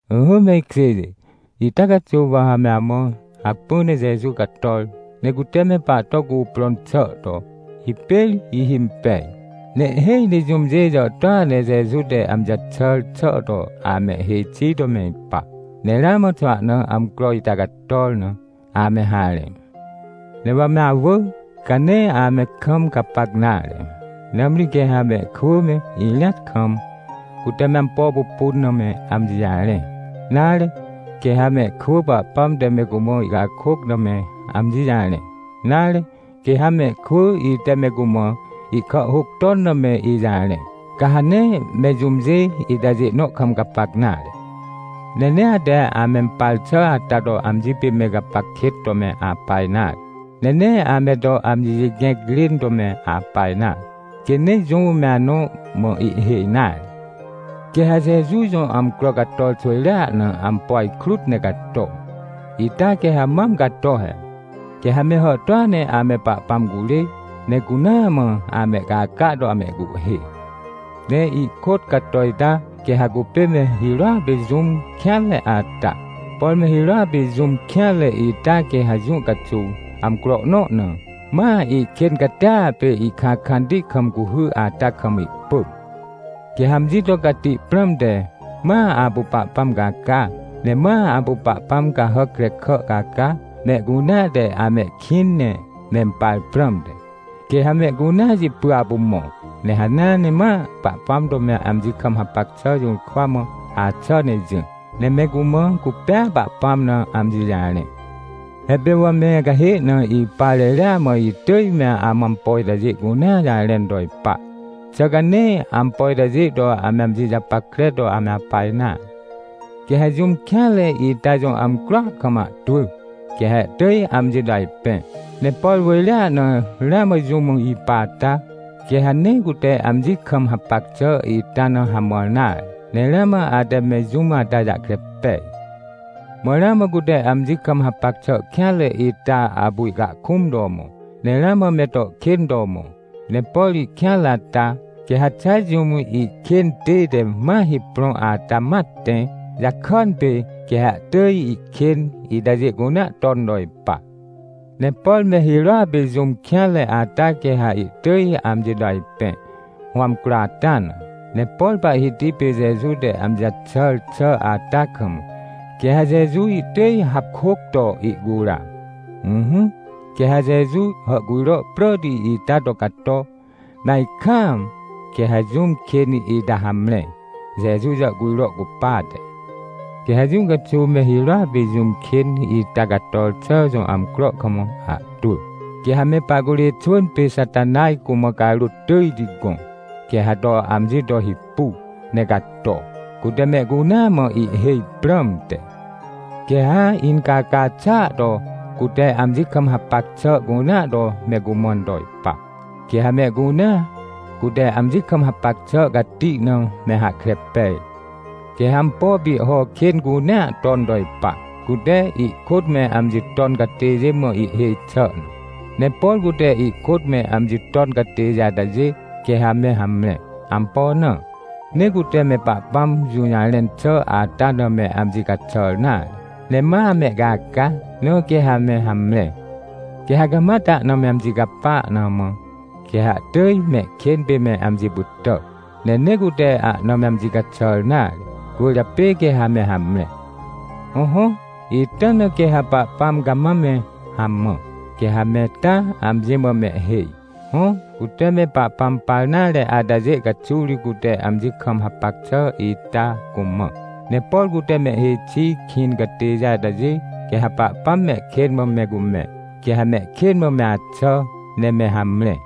Ỹhỹ me ikjêjê, ita caxuw wa ha me amã hacpỹ ne Jeju cator, ne cute me pahto cuprõn xà to, hipêr ihimpej. Ne ihhêj ne jũmjê jàhtôa ne Jeju te amji jaxàr xà to amehhêj xi to me ipa. Ne ramã xwahna amcro ita cator na, ame harẽ. Ne wa me awỳ, ca nee ame kam gapac nare. Nãmri quê ha mehkwỳ me irĩat kam, cute me ampo pupun na me amji jarẽ, nare, quê ha mehkwỳ Pahpãm te me cumã ihcakôc na me amji jarẽ, nare, quê ha mehkwỳ ite me cumã ihkàhhôc ton na me ijarẽ, ca ha nee me jũmjê itajê nõ kam gapac nare. Ne nee ate amempar xà ata to amji pê me gapac kêt to me apa nare, ne nee ame to amji jigẽc rên to me apa nare, quê nee jũm me anõ mã ihhêj nare. Quê ha Jeju jõ amcro cator xwỳjrea na ampo ajkrut ne cato. Ita quê ha mam cato he. Quê ha me hàhtôa ne ame Pahpãm curê, ne cunaa mã amehcaca to amehcuhhê. Ne ihkôt cato ita, quê ha cupê me hirôa pê jũm kêanre ata. Por me hirôa pê jũm kêanre ita quê ha jũ caxuw, amcro nõ na, ma ihkên catia pê ihkãkãnti kam cuhy ata kam ihpỳm. Quê ha amji to cati prãmte, ma apu Pahpãm caca, ne ma apu pahpãm cahàc krekà caca, mehcunea te amehkĩn ne mempar prãmte. Quê ha mehcunea jipy apu mõ, ne hanea ne ma Pahpãm to me amji kam hapac xà jũrkwa mã axà ne jỹ, ne me cumã cupêa Pahpãm na amji jarẽ. He pê wa me acahê na ipa reria mã itỳj me amã ampo itajê cunea jarẽn to ipa. Xà ca nee ampo itajê to ame amji japackre to ame apa nare? Quê ha jũm kêanre ita jõ amcroa kam ahtwỳ, quê ha ihtỳj amji to ajpẽ. Ne por wỳjrea na ramã jũm ipa ata, quê ha nee cute amji kam hapac xà ita na hamãr nare. Ne ramã ate me jũm ata jahkre pej. Mã ramã cute amji kam hapac xà kêanre ita apu ihcahkũm to mõ. Ne ramã me to kên to mõ. Ne por ihkêanre ata, quê ha xa jũm ihkên tête ma hiprõ ata ma tẽ, jakàn pê quê ha ihtỳj ihkên itajê cunea ton to ipa. Ne por me hirôa pê jũm kêanre ata quê ha ihtỳj amji to ajpẽ, hõ amcro ata na. Ne por Pahhiti pê Jeju te amji jaxàr xà ata kam, quê ha Jeju ihtỳj hapkôc to ihcura. Ỹhỹ, quê ha Jeju hàhcujro pràti ita to cato, me ajkaam, quê ha jũm kên ita hamre, Jeju jàhcujro cupate. Quê ha jũ caxuw me hirôa pê jũm kên ita cator xà jõ amcro kam ahtwỳ, quê ha me pahcurê xwỳn pê Xatanaj cumã carôt tỳjti gõ, quê ha to amji to hipu, ne cato, cute mehcunea mã ihhêj prãmte. Quê ha incaca xàa to cute amji kam hapac xà cunea to me cumãn to ipa. Quê ha mehcunea, cute amji kam hapac xà cati na me hahkre pej. Quê ha ampo pihho kên cunea ton to ipa, cute ihkôt me amji ton catêjê mã ihhêj xi xà na. Ne por cute ihkôt me amji ton catêjê atajê, quê ha me hamre. Ampo na? Nee cute me Pahpãm jũjarẽn xà ata na me amji caxàr nare, ne ma amehcaca, na quê ha me hamre. Quê ha cama tahna me amji capa na mã, quê ha ihtỳj mehkên pê me amji pytà. Ne nee cute ahna me amji caxàr nare, cwỳrjapê quê ha me hamre. Hõhõ, ita na quê ha Pahpãm cama me hamã, quê ha me taa amji mã mehhêj. Hõ, cute me Pahpãm par nare atajê caxuw ri cute amji kam hapac xà ita cumã. Ne por cute mehhêj xi kĩn catêjê atajê, quê ha Pahpãm mehkên mã me cumẽ, quê ha mehkên mã me axà ne me hamre.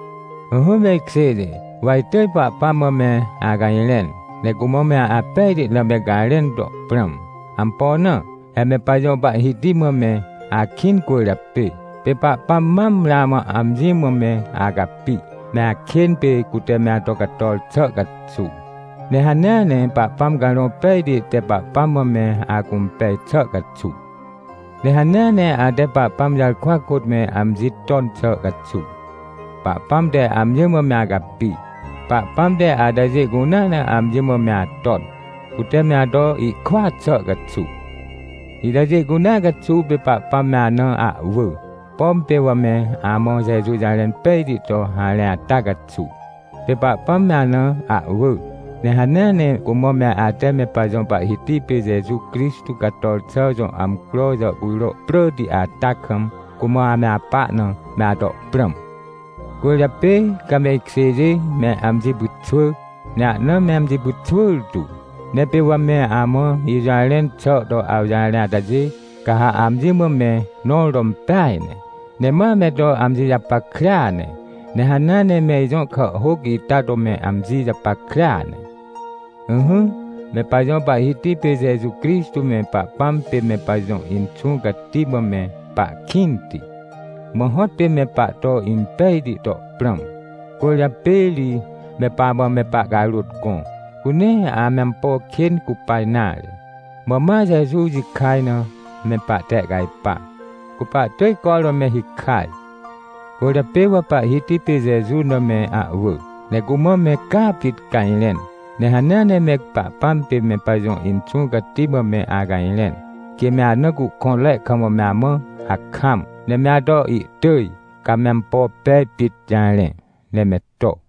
Ỹhỹ me ikjêjê, wa itỳj Pahpãm mã me acajrẽn, ne cumã me apejti na me garẽn to prãm. Ampo na? He me pajõ Pahhiti mã me akĩn cwỳrjapê. Pê Pahpãm mam ramã amji mã me acapi, me akên pê cute me ato cator xà caxuw, ne hanea ne Pahpãm Carõ Pejti te Pahpãm mã me acũmpej xà caxuw. Ne hanea ne ate Pahpãm jarkwa kôt me amji ton xà caxuw, Pahpãm te amji mã me acapi. Pahpãm te atajê cunea na amji mã me aton, cute me ato ihkwỳa xà caxuw. Itajê cunea caxuw pê Pahpãm me ana ahwỳ. Pom pê wa me amã Jeju jarẽn pejti to harẽ ata caxuw, pê Pahpãm me ana ahwỳ. Ne hanea ne cumã me ate me pajõ Pahhiti pê Jeju Crixtô cator xà jõ amcro jàhcujro pràti ata kam, cumã ame apa na me ato prãm. Cwỳrjapê, ca me ikjêjê, me amji pyxwỳ, ne ahna me amji pyxwỳr tu. Ne pê wa me amã ijũjarẽn xà to awjarẽ atajê, ca ha amji mã me nõr to impeaj ne. Ne ma me to amji japackrea ne. Ne hanea ne me ijõ kàhhôc ita to me amji japackrea ne. Ỹhỹ, me pajõ Pahhiti pê Jeju Crixtô me Pahpãm pê me pajõ Inxũ Cati mã me pahkĩnti, mã hõtpê me pahto impejti to prãm. Cwỳrjapê ri me pamã me pahcarôt gõ, cu nee ame ampo kên cupa nare, mã ma Jeju jikaj na me pahtehcajpa, cu pahtỳj cormã me hikaj. Cwỳrjapê wa Pahhiti pê Jeju na me ahwỳ, ne cumã me caa pit cajrẽn, ne hanea ne me Pahpãm pê me pajõ Inxũ Cati mã me acajrẽn, quê me ana cuhkõnre kam me amã hakam, ne me ato ihtỳj, ca me ampo pej pit jarẽ, ne me to.